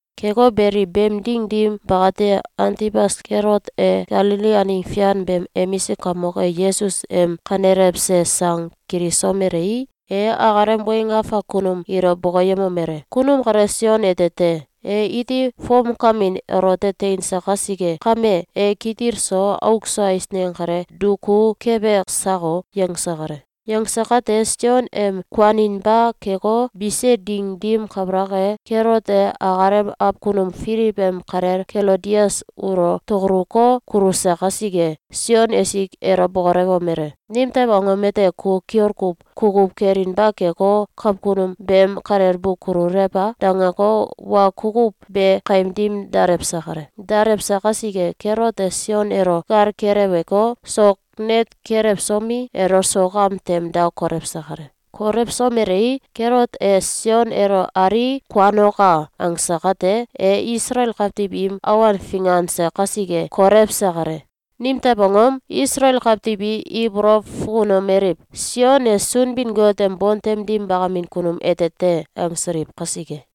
Keko beli, beem ding dim bakate, Antibas Kelot e Galili aneng fian beem emisik kamok e Yesus em kanelewse sang kilisomelei, e akalem weng afak kunum ilo bokoyemomele: “Kunum kale Sion ete te. E iti fomkamin elote teinse kasike kame, e kitil so auk so eisneng kale duku kebe sako!”, yangse kale. Yangse kate, Sion em kuaninba keko, bise ding dim kabalak e, Kelot e akalem awkunum Filiw em kalel Kelodias ulo tokoluko, kuluse kasike, Sion esik elo bokolewomele: “Nimtew angom ete ku kiol kuw kukuw kelinba keko, kakunum beem kalel bu kululew a?”, dangeko, wa kukuw be kaim dim dalewse kale. Dalewse kasike, Kelot e Sion elo gal keleweko, sok net kelewsomi, elo sok am tem da kolewse kale. Kolewsomelei, Kelot e “Sion elo alii, kuanoka!”, angse kate, e Isalael kawtiw im awan finganse kasike, kolewse kale. Nimew angom? Isalael kawtiw i ibolow fukunomeliw: “Sion e Sunbin-Got em bontem dim bakamin kunum ete te!”, angsiliw kasike.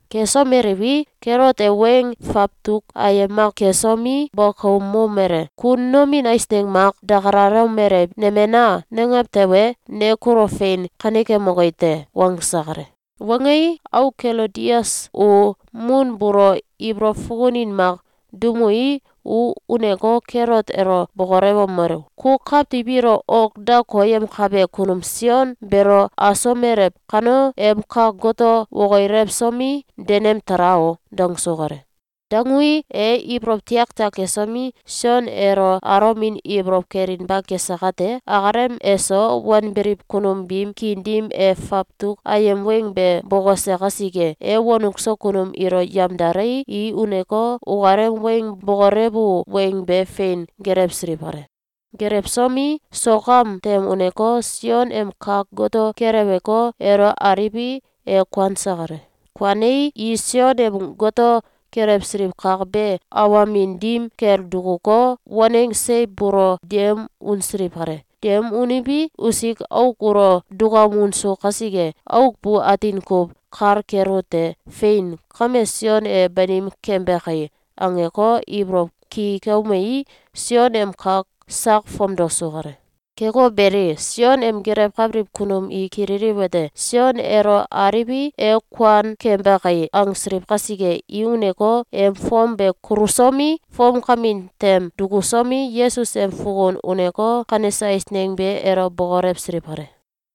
Kesomeliwi, Kelot e weng fawtuk ayem mak kesomi, bokoumomele: “Ku nomin eisneng mak dakalalomelew: ‘Nemena!’, nangew tewe, ne kulo fein kanekemoki te.”, wangse kale. Wangei, auk Kelodias u mun buulo ibolow fukunin mak duumui, u uneko, Kelot elo bokolewomelu: “Ku kawtiw ilo ok da koyemkabe kunum Sion beelo asomelew kano, em kak goto wokilewsomi, denem tala o!”, dangsu kale. Dangui, e ibolow tiaktiak kesomi, Sion elo alomin ibolow kelinba kese kate, akalem eso wanbiliw kunum biim kiin dim e fawtuk ayem weng be bokose kasike, e wonuk so kunum ilo yamdalei, i uneko, ukalem weng bokolewu weng be fein gelewsiliw kale. Gelewsomi, sok am tem uneko, Sion em kak goto keleweko, elo aliwi, e kuanse kale. Kuanei, i Sion em goto kelewsiliw kak be awamin dim kel dukuko, waneng seiw buulo deum unsiliw kale. Deum uniwi, usik auk ulo dukaum unsu kasike, auk bu atin kuw kal kelute: “Fein! Kame Sion e banim kembe kai!”, angeko, ibolow ki keumei, Sion em kak sak fomdosu kale. Keko beli, Sion em gelewkabiliw kunum i kililiwete: “Sion elo aliwi, e kuan kembe kai!”, angsiliw kasike, i uneko, em fom be kulsomi, fomkamin tem dukusomi, Yesus em fukun uneko, kanese eisneng be elo bokolewsiliw kale.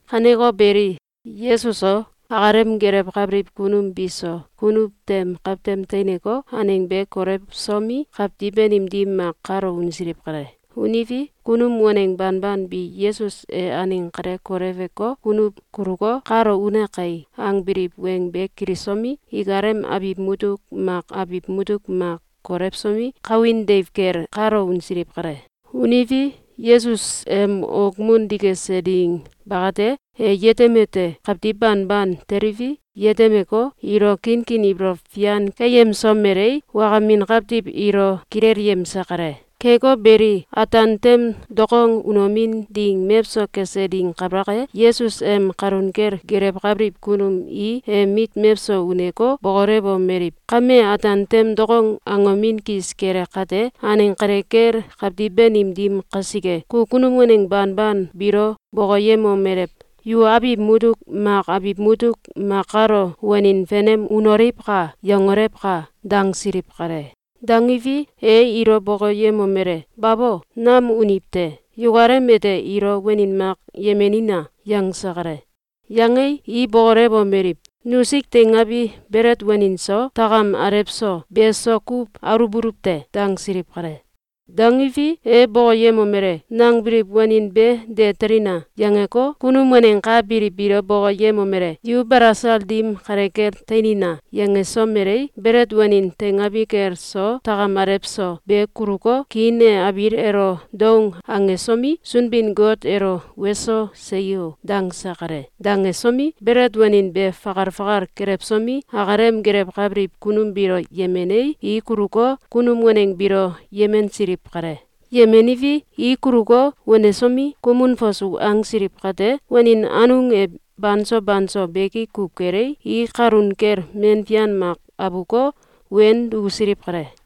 Kaneko beli, Yesus so, akalem gelewkabiliw kunum biso kunuw tem kawtem teineko, aneng be kolewsomi, kawtiw banim dim mak kalo unsiliw kale. Uniwi, kunum waneng banban bi “Yesus e aneng kale koleweko, kunuw kuluko, kalo une kai!”, angbiliw weng be kilisomi, ikalem abiw mutuk mak abiw mutuk mak kolewsomi, kawin deiw kel kalo unsiliw kale. Uniwi, Yesus em okmun dikese ding bakate, e yetemete: Kawtiw banban teliwi, yetemeko, ilo kinkin ibolow fian keyemsomelei, wakamin kawtiw ilo kilelyemse kale. Keko beli, ataan tem dokong unomin ding mewso kese ding kabalak e, Yesus em kalun kel gelewkabiliw kunum i em mit mewso uneko, bokolewomeliw: “Kame ataan tem dokong angomin kis kele kate, aneng kale kel kawtiw banim dim kasike, ku kunum waneng banban biilo bokoyemomelew: ‘Yu abiw mutuk mak abiw mutuk mak kalo wanin fenem unoliwka!’, yangolewka!”, dangsiliw kale. Dangiwi, e ilo bokoyemomele: “Babo. Nam uniw te. Yukalem ete ilo wanin mak yemenina!”, yangse kale. Yangei, i bokolewomeliw: “Nusik teingabi belet wanin so, takam alew so, be so kuw aluwbuluw te.”, dangsiliw kale. Dangiwi, e bokoyemomele: “Nangbiliw wanin be de telina!”, yangeko, kunum waneng ka biliw biilo bokoyemomele: “Yu balasal dim kale kel teinina!”, yangesomelei, belet wanin teingabi kel so takam alew so, be kuluko, kiin e abiil elo doung angesomi, Sunbin-Got elo “Weso! Seyo!”, dangse kale. Dangesomi, belet wanin be fakal fakal kelewsomi, akalem gelewkabiliw kunum biilo yemenei, i kuluko, kunum waneng biilo yemensiliw kale. Yemeniwi, i kuluko, wanesomi, kumun fasu angsiliw kate, wanin anung e banso banso beki kuw kelei, i kalun kel men fian mak abuko, wen dukusiliw kale.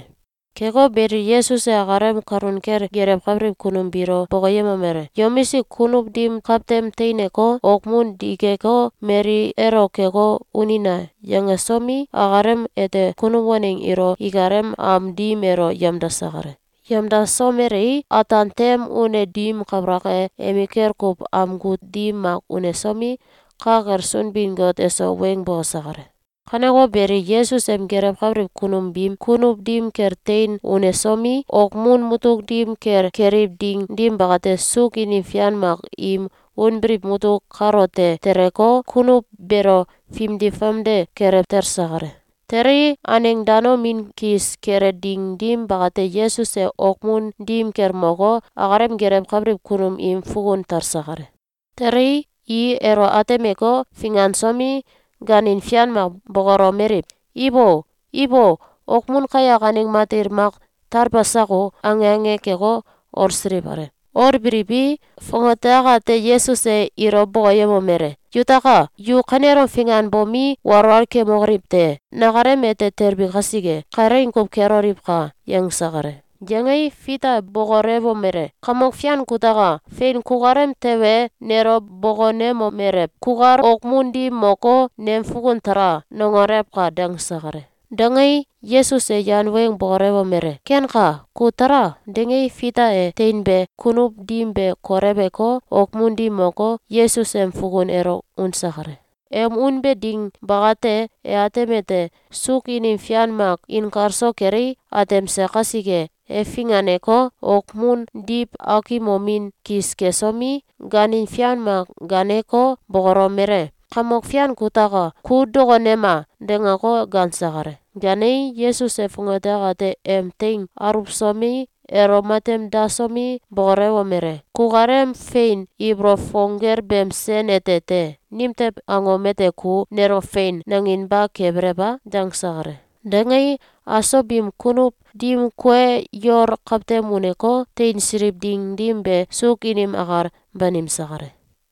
Keko beli, Yesus e akalem kalun kel gelewkabiliw kunum biilo bokoyemomele: “Yomisik kunuw dim kawtem teineko, okmun dikeko, mali elo keko, unina!”, yangesomi, akalem ete kunum waneng ilo ikalem am dim elo yamdase kale. Yamdasomelei, ataan tem une dim kabalak e, emikel kuw amgu dim mak unesomi, ka kel Sunbin-Got eso weng bokose kale. Kaneko beli, Yesus em gelewkabiliw kunum biim kunuw dim kel tein unesomi, okmun mutuk dim kel keliw ding dim bakate, suuk inim fian mak im unbiliw mutum kalote teleko, kunuw beelo fimdi famde kelew talse kale. Telei, aneng danomin kis kele ding dim bakate, Yesus e okmun dim kel moko, akalem gelewkabiliw kunum im fukun talse kale. Telei, i elo atemeko, fingansomi, gaanin fian mak bokolomeliw: “Ibo, ibo! Okmun kayak aneng matil mak talbe sako!”, ange ange keko, olsiliw kale. Olbiliwi, fongate akate Yesus e ilo bokoyemomele: “Yutaka! Yu kanelom finganbomi, walwal kemokoliw te! Nakalem ete telbi kasike, kalaing kuw keloliwka!”, yangse kale. Yangei, Fita e bokolewomele: “Kamok Fian kutaka! Fein kukalem tewe, nelo bokonemomelew: ‘Kukal okmun dim moko, nem fukun tala!’, nangolewka!”, dangse kale. Dangei, Yesus e yan weng bokolewomele: “Kenka. Ku tala!”, dangei, Fita e teinbe kunuw dim be koleweko, okmun dim moko, Yesus em fukun elo unse kale. Em unbe ding bakate, e atemete: Suuk inim fian mak inkalso kelei, atemse kasike, e finganeko, okmun diw akimomin kis kesomi, gaanin fian mak gaaneko, bokolomele: “Kamok Fian kutaka! Ku dokonema!”, dangeko, gaanse kale. Gaanei, Yesus e fongate akate em teing aulewsomi, elo matem dasomi, bokolewomele: “Kukalem fein ibolow fong gel beem sen ete te! Nimtew angom ete ku nelo ‘Fein!’, nanginba kebelew a?”, dangse kale. Dangei, aso biim kunuw dim kue yol kawtem uneko, teinsiliw ding dim be, suuk inim akal banimse kale.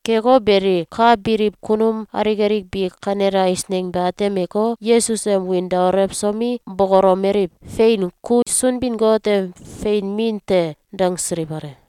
Keko beli, ka biliw kunum alik alik bi kanele eisneng be atemeko, Yesus em wiin daolewsomi, bokolomeliw: “Fein! Ku Sunbin-Got em fein Min te!”, dangsiliw kale.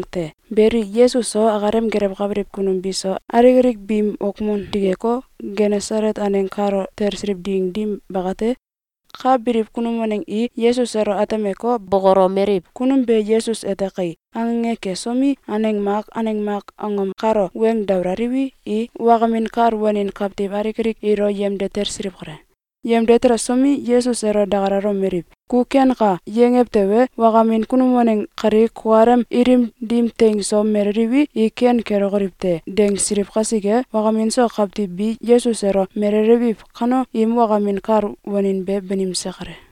Beli, Yesus so, akalem gelewkabiliw kunum biso, alik alik biim okmun dikeko, Genesalet aneng kalo talsiliw ding dim bakate, ka biliw kunum waneng i Yesus elo atemeko, bokolomeliw: “Kunum be Yesus ete kai!”, ange ange kesomi, aneng mak aneng mak angom kalo weng dabalaliwi, i wakamin kal wanin kawtiw alik alik ilo yemde talsiliw kale. Yemde telesomi, Yesus elo dakalalomeliw: “Ku ‘Kenka!’, yangew tewe, wakamin kunum waneng kali kukalem ilim dim teing so meleliwi, i ken kelokoliw te!”, dangsiliw kasike, wakamin so kawtiw bi Yesus elo melelewiw kano, im wakamin kal wanin be banimse kale.